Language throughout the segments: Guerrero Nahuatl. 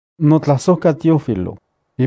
NotlajsojkaTeófilo,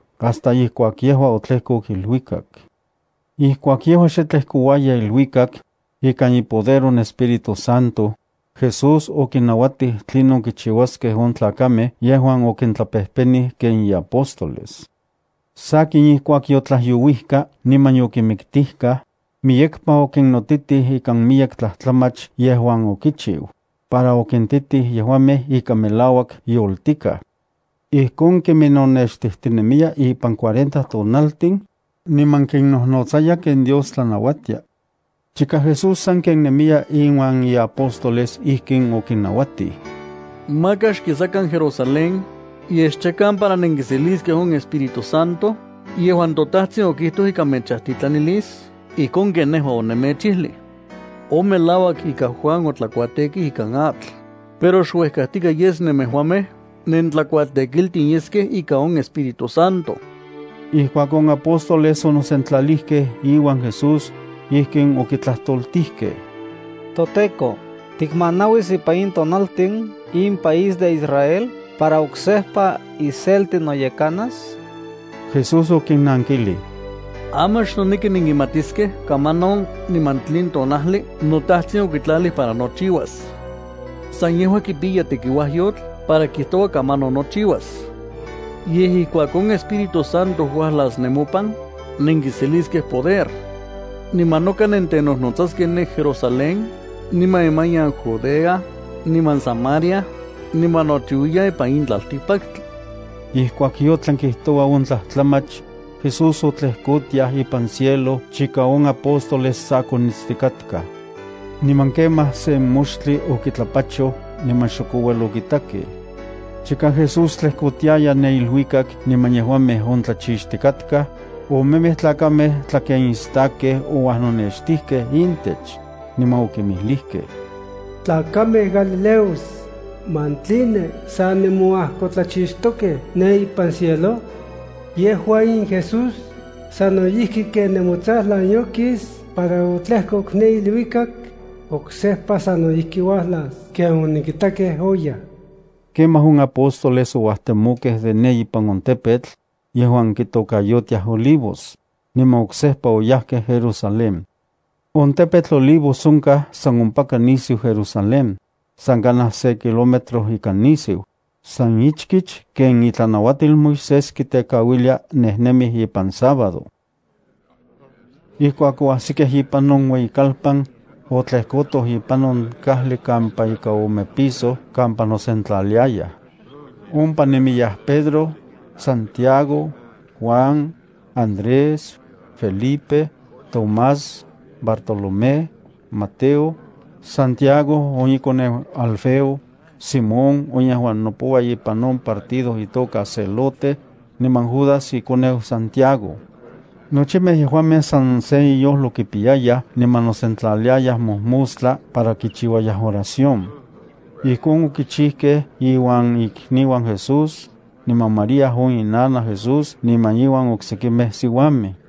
hasta ijkuak yejua otlejkok iluikak. Ijkuak yejua xe tlejkouaya iluikak, ika ipoder on Espíritu Santo, Jesús okinnauatij tlinon kichiuaskej on tlakamej yejuan okintlapejpenij ken iapóstoles. Sakin ijkuak yotlajyouijka niman yokimiktikaj, miyekpa okinnotitij ikan miyek tlajtlamach yejuan okichiu, para okintitij yejuamej ika melauak yoltikaj. Ijkon kiminnonextijtinemiya ipan cuarenta tonaltin, niman kinnojnotsaya ken Dios tlanauatia. Chika Jesús sanken nemiya iuan iapóstoles ijkin okinnauatij: —Maka xkisakan Jerusalén, yej xchakan para nenkiseliskej on Espíritu Santo yejuan toTajtsin okijtoj ika mechajtitlanilis ijkon ken nejua onemechijlij. On melauak ika Juan otlakuatekij ikan atl, pero xuejkajtikaj yes nemejuamej nentlakuatekiltin yeskej ikan on Espíritu Santo. Ijkuak on apóstoles onosentlalijkej iuan Jesús, ijkin okitlajtoltijkej: —ToTEKO, ¿tikmanauis ipan in tonaltin in país de Israel para oksejpa iselti noyekanas? Jesús okinnankilij: —Aman xnoneki nenkimatiskej kamanon niman tlen tonajli toTajtsin okitlalij para nochiuas. San yejua kipiya tekiuajyotl para kijtoua kamanon nochiuas. Yej, ijkuak on Espíritu Santo uajlas nemopan, nenkiseliskej poder. Niman noka nentenojnotsaskej ne Jerusalén, niman imanian Judea, niman Samaria, niman nochiuiyan ipan in tlaltikpaktli. Ijkuak yotlan kijtoua on tlajtlamach, Jesús otlejkotiaj ipan cielo chika on apóstoles sa konitstikatkaj. Niman kemaj sen moxtli okitlapachoj niman xok ouel okitakej. Chika Jesús tlejkotiaya ne iluikak niman yejuamej ontlachixtikatkaj, omemej tlakamej tlakenistakkej ouajnonextijkej intech, niman okinmijlijkej: —Tlakamej galileos, ¿man tline sa nemonajkotlachixtokej ne ipan cielo? Yejua in Jesús sano ijki ken nemotsajlan yokis para otlejkok ne iluikak, oksejpa sano ijki uajlas ken onenkitakej oyaj. Kemaj on apóstoles ouajtemokej de ne ipan on tepetl, yejuan kitokayotiaj Olivos, niman oksejpa oyajkej Jerusalén. On tepetl Olivos onkaj san ompaka nisiu Jerusalén, san kanaj se kilómetro ika nisiu, san ichkich ken itlanauatil Moisés kitekauilia nejnemij ipan sábado. Ijkuak oajsikej ipan on ueyikalpan, otlejkotoj ipan on kajli kampa ika ome piso kampa nosentlaliayaj. Ompa nemiyaj Pedro, Santiago, Juan, Andrés, Felipe, Tomás, Bartolomé, Mateo, Santiago on ikoneu Alfeo, Simón on yejuan nopoua ipan on partido itoka Celote, niman Judas ikoneu Santiago. Nochimej yejuamej san se inyojlo kipiyayaj niman nosentlaliayaj mojmostla para kichiuayaj oración. Ijkon okichijkej iuan ikniuan Jesús, niman María on inanaj Jesús niman iuan oksekimej siuamej.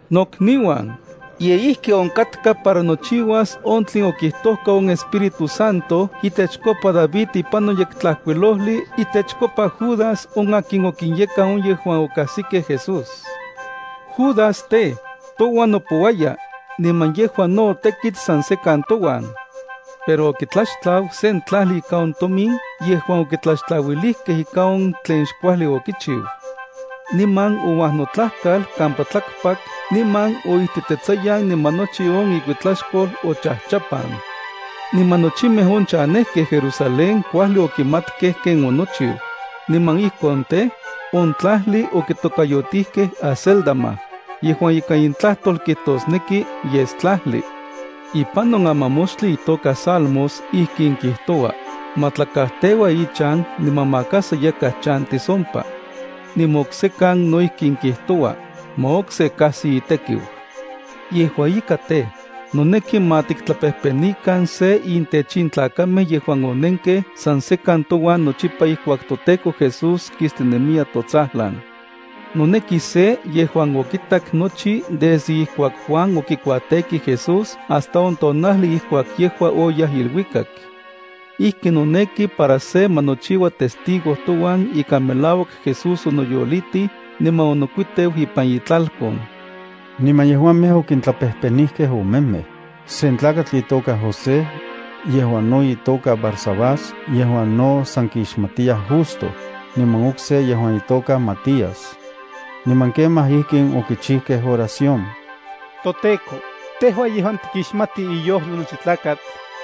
—Nokniuan, ye ijki onkatka para nochiuas on tlen okijtojka on Espíritu Santo itechkopa David ipan on Yektlajkuilojli itechkopa Judas on akin okinyekan on yejuan okajsikej Jesús. Judas tej, touan nopouaya, niman yejua no otekit san sekan touan. (Pero okitlaxtlau sen tlajli ika on tomin yejuan okitlaxtlauilijkej ikan on tlen xkuajli okichiu. Niman ouajnotlajkal kampa tlakpak niman oijtitetsayan niman nochi on ikuitlaxkol ochajchapan. Niman nochimej on chanejkej Jerusalén kuajli okimatkej ken onochiu, niman ijkon tej, on tlajli okitokayotijkej Acéldama, yejuan ikan intlajtol kijtosneki Yestlajli.) Ipan on amamoxtli itoka Salmos ijkin kijtoua: Ma tla kajteua ichan niman maka sa yakaj chantis ompa. Niman oksekan no ijkin kijtoua: Ma okse kajsi itekiu. ’Yejua ika tej, noneki ma tiktlapejpenijkan se intech in tlakamej yejuan onenkej sa sekan touan nochipa ijkuak toTEKO Jesús kistinemiya totsajlan. Noneki se yejuan okitak nochi desde ijkuak Juan okikuatekij Jesús hasta on tonajli ijkuak yejua oyaj iluikak. Ijki noneki para se ma nochiua testigo touan ika melauak Jesús onoyolitij niman onokuiteu ipan itlalkon. Niman yejuamej okintlapejpenijkej omemej: sen tlakatl itoka José, yejuan no itoka Barsabás yejuan no san kixmatiyaj Justo, niman okse yejuan itoka Matías. Niman kemaj ijkin okichikej oración: —ToTEKO, tejua yejuan tikixmati iyojlo nochi tlakatl,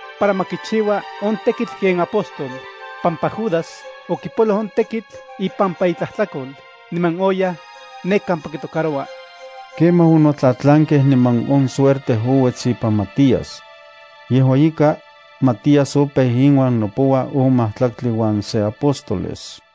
para ma kichiua on tekitl ken apóstol, pampa Judas okipoloj on tekitl ipampa itlajtlakol niman oyaj ne kampa kitocaroua. Kemaj onotlatlankej niman on suerte ouets ipan Matías. Yejua ika, Matías opeu inuan nopoua on majtlaktli uan se apóstoles.